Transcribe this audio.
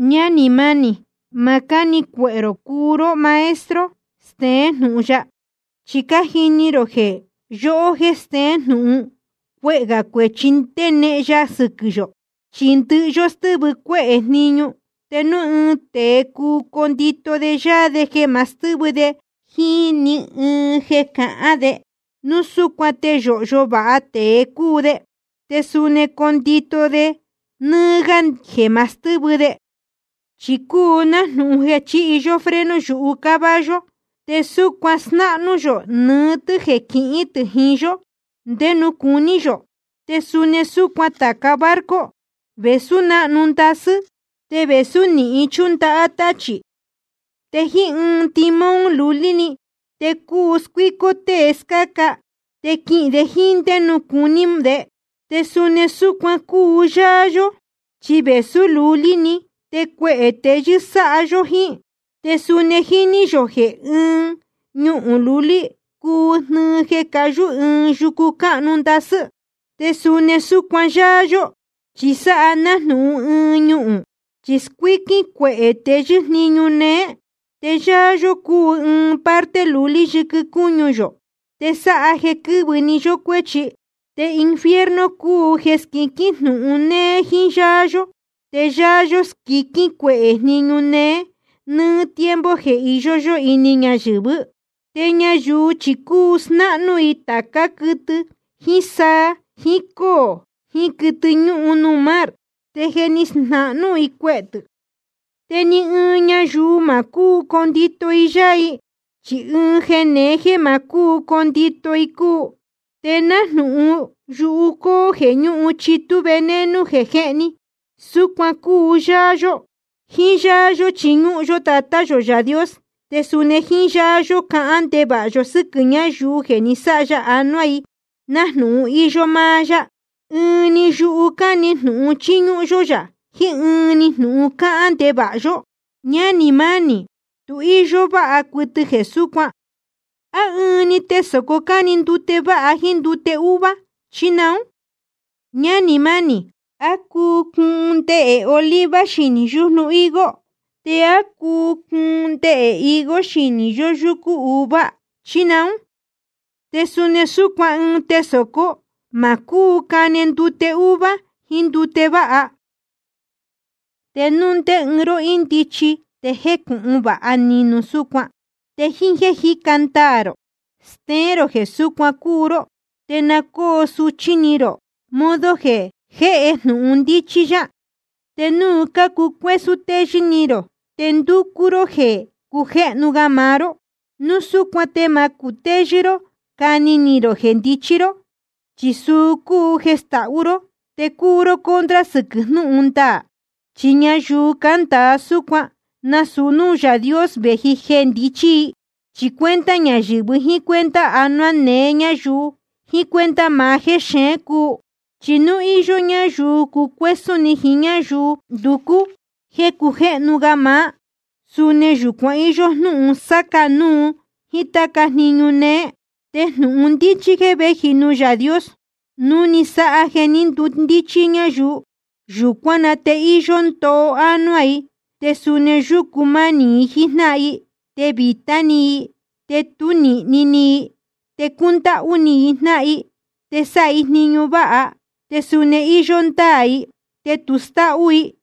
Ñánī mánī, ma cáni ni cuehē rō cuu ró maestro steén jnūhun ya. Chi cájini rō jeē yóhó jéē steén jnūhun, cuehē gā cuēchi ndenehen ya sɨquɨ̄ yō. Chi ndɨhɨ yó stɨ́vɨ cuéhē jniñu. Te núu ɨɨn tēe cuu condito de yáá de jeē ma stɨ́vɨ de jíín ni ɨɨn jeē cahán de, núu súcuan te yōhyo vāha tēe cúu de, te suni cuu condito de nɨ́ɨ́ gá de jeē ma stɨ́vɨ de. Chi cúu nájnūhun jeē chíhi yó freno yuhu caballo, te súcuan snáhnú yō nɨɨ́ tɨ́ jeē quihín tɨ̄ jiín yó ndé nuū cuní yō. Te suni súcuan tāca barco, vēsú náhnu ndasɨ́, te vēsú nīhin chúndahá táchī, te jíín ɨɨn timón lulí‑ni te cuu scuícó tée scáca, te quihīn de jíín ndé nuū cuní de. Te suni súcuan cúu yáá yó, chi vēsú lulí‑ni, te cuehē teyɨ́ sáha yó jíín. Te suni jíní yō jeē ɨɨn ñuhūn lulí cuu jnɨɨ jeē cayú ɨɨn yucu cáhnu ndasɨ́. Te suni súcuan yáá yó, chi sáha nájnūhun ɨɨn ñuhūn, chi scuíquín cuehē teyɨ́ jniñu néé. Te yáá yó cúu ɨɨn parte lulí yɨquɨ cúñu yō, te sáha jeē quɨ́vɨ nɨ́ɨ́ yó cuēchi. Te infierno cúu jeē scuiquín jnūhun néé jíín yáá yó, te yáá yó scuiquín cuehē jniñu néé nɨ́ɨ́ tiempo jeē iyó yó ini ñayɨ̄vɨ́. Te ñayuu chi cuu snáhnú i tācá quɨtɨ jíín saa jiín cóō jiín quɨtɨ ñúhun nuū mar, te je ni snahnú i cuehē tɨ̄. Te ni ɨɨn ñayuu ma cúu condito i yáá i. Chi ɨɨn jeē neé jéē ma cúu condito i cúu. Te nájnūhun yuhu cóó jeē ñúhun chitú veneno jeē jéhni, súcuan cúu yáá yó. Jíín yáá yó chiñúhún yó Tatá yō Yaā Dios, te suni jíín yáá yó cahán ndevāha yo sɨ́quɨ̄ ñáyuu jeē ni sáha ya ánuá i nájnūhun íyó máá yá. Ɨɨn‑ni yuhu cáne jnūhun chíñúhún yó yá jiín jnúhun cáhán ndevāha yó. Ñánī mánī, tu íyó váha cuɨtɨ jeē súcuan. ¿A ɨɨn‑ni tesōcó cáne ndute váha jíín ndute úvuá, chí naún? Ñánī mánī, ¿á cuu cuun ndehē oliva xinī yújnu higo, te á cuu cuun ndehē higo xinī yoyúcú uva, chí naún? Te suni súcuan ɨɨn tesōcó ma cúu cane ndute úhvuá jíín ndute váha. Te núu ndé ɨɨn ró ndíchí te jécūhun vāha ni, núu súcuan te jíín jéē jíca ndaā rō steén rō jeē súcuan cúu ró. Te na cóo suchí ni rō modo jeē jéhe jnūhun ndíchí yá. Te núu cácucuésún teyɨ́ ni rō te ndúcú ró jéē cujéhnu máá ró, núu súcuan te ma cutéyɨ́ ró cani ni rō jeē ndichí ró. Chi suu cúu jeē stahú ró, te cúu ró contra sɨquɨ̄ jnúhun ndaā. Chi ñayuu cándāa súcuan, nasūu núū Yaā Dios vēji jeē ndichí i. Chi cuenta ñayɨ̄vɨ, jíín cuenta anuá neé ñáyuu, jiín cuenta maá jéxeén cúu. Chi nuū iyó ñáyuu cucuésún ni jiín ñáyuu nducú jéē cujéhnu máá, suni yūcuan íyó jnúhun sáca núu jíín táca jniñu néé. Te jnūhun ndíchí jeē véji nuū Yaā Dios, núu ni sáha jeē ní ndundíchí ñáyuu, yūcuán na te íyó ndoo ánuá i. Te suni yúcu manī i jíín jnáhan i, te vītá ni i, te tú nīhni ni i. Te cúndáhú ni i jnáhan i, te sáha i jniñu váha. Te suni íyó ndáā i, te tu stáhú i.